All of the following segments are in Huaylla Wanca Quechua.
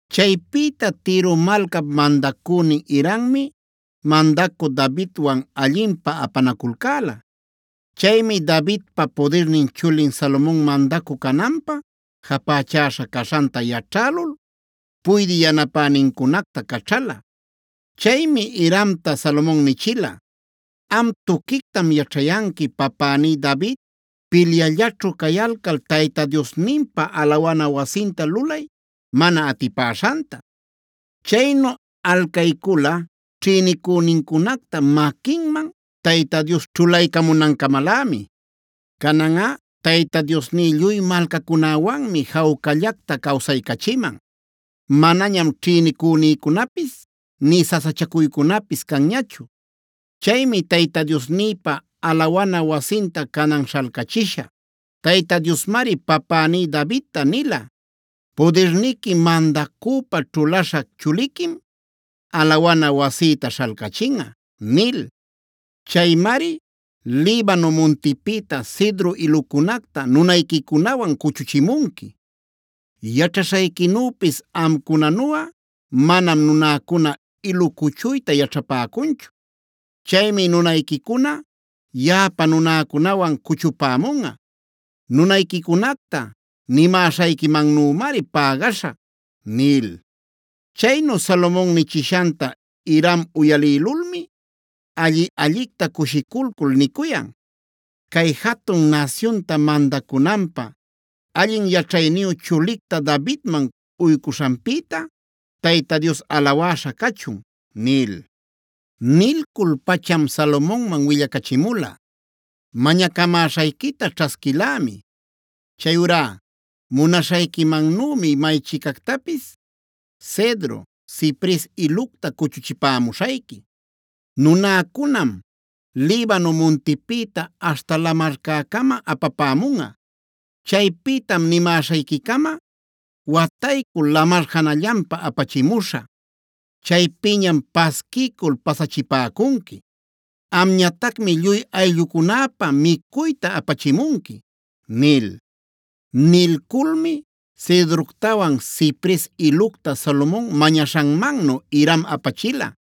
Chaypïta Tiro malcap mandacünin Hirammi mandacü Davidwan allinpä apanaculcäla. Chaymi Davidpa pudirnin chulin Salomon mandacü cananpä japächaśha caśhanta yaćhälul puydï yanapänincunacta caćhala. Chaymi Hiramta Salomon nichila: “Am tuquictam yaćhayanqui papäní David pilyallaćhu cayalcal Tayta Diosninpa alawana wasinta lulay mana atipäśhanta. Chaynu alcaycula ćhïnicünincunacta maquinman Tayta Dios ćhulaycamunancamalämi. Cananꞌa Tayta Diosní lluy malcacunäwanmi jawcallacta cawsaycachiman; manañam ćhïnicünïcunapis, nï sasachacuycunapis canñachu. Chaymi Tayta Diosnïpä alawana wasinta canan śhalcachishä. Tayta Diosmari papäní Davidta nila: ‘Pudirniqui mandacüpa ćhulaśhä chuliquim alawana wasïta śhalcachinꞌa’ nil. Chaymari Libano muntipïta cedro ilucunacta nunayquicunawan cuchuchimunqui. Yaćhaśhayquinüpis amcunanuꞌa manam nunäcuna ilu cuchuyta yaćhapäcunchu. Chaymi nunayquicuna yaꞌapa nunäcunawan cuchupämunꞌa. Nunayquicunacta nimäśhayquimannümari pägaśhä” nil. Chaynu Salomon nichishanta Hiram uyalïlulmi alli-allicta cushiculcul nicuyan: “Cay jatun nasyunta mandacunanpä allin yaćhayniyu chulicta Davidman uycuśhanpïta Tayta Dios alawäśha cachun” nil. Nilcul-pacham Salomonman willacachimula: “Mañacamäśhayquita ćhasquilämi. Chayurá munaśhayquimannümi maychicactapis cedro, cipres ilucta cuchuchipamuśhayqui. Nunäcunam Libano muntipïta aśhta lamarcäcama apapämunꞌa. Chaypïtam nimäśhayquicama wataycul lamar janallanpa apachimuśhä. Chaypïñam pasquiycul pasachipäcunqui. Amñatacmi lluy ayllücunapä micuyta apachimunqui” nil. Nilculmi cedroctawan, cipres ilucta Salomon mañaśhanmannu Hiram apachila.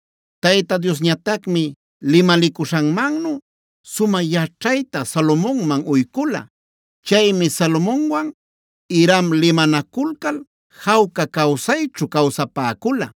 Tayta Diosñatacmi limalicuśhanmannu sumä yaćhayta Salomonman uycula. Chaymi Salomonwan Hiram limanaculcal jawca cawsayćhu cawsapäcula.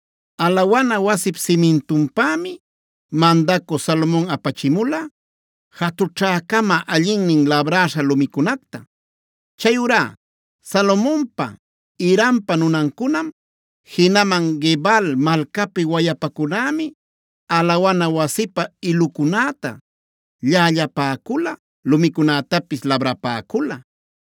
Alawana wasip simintunpämi mandacü Salomon apachimula jatućhäcama allinnin labräśha lumicunacta. Chayurá Salomonpa, Hirampa nunancunam, jinaman Gebal malcapi wayapacunämi alawana wasipä ilucunäta llällapäcula, lumicunätapis labrapäcula.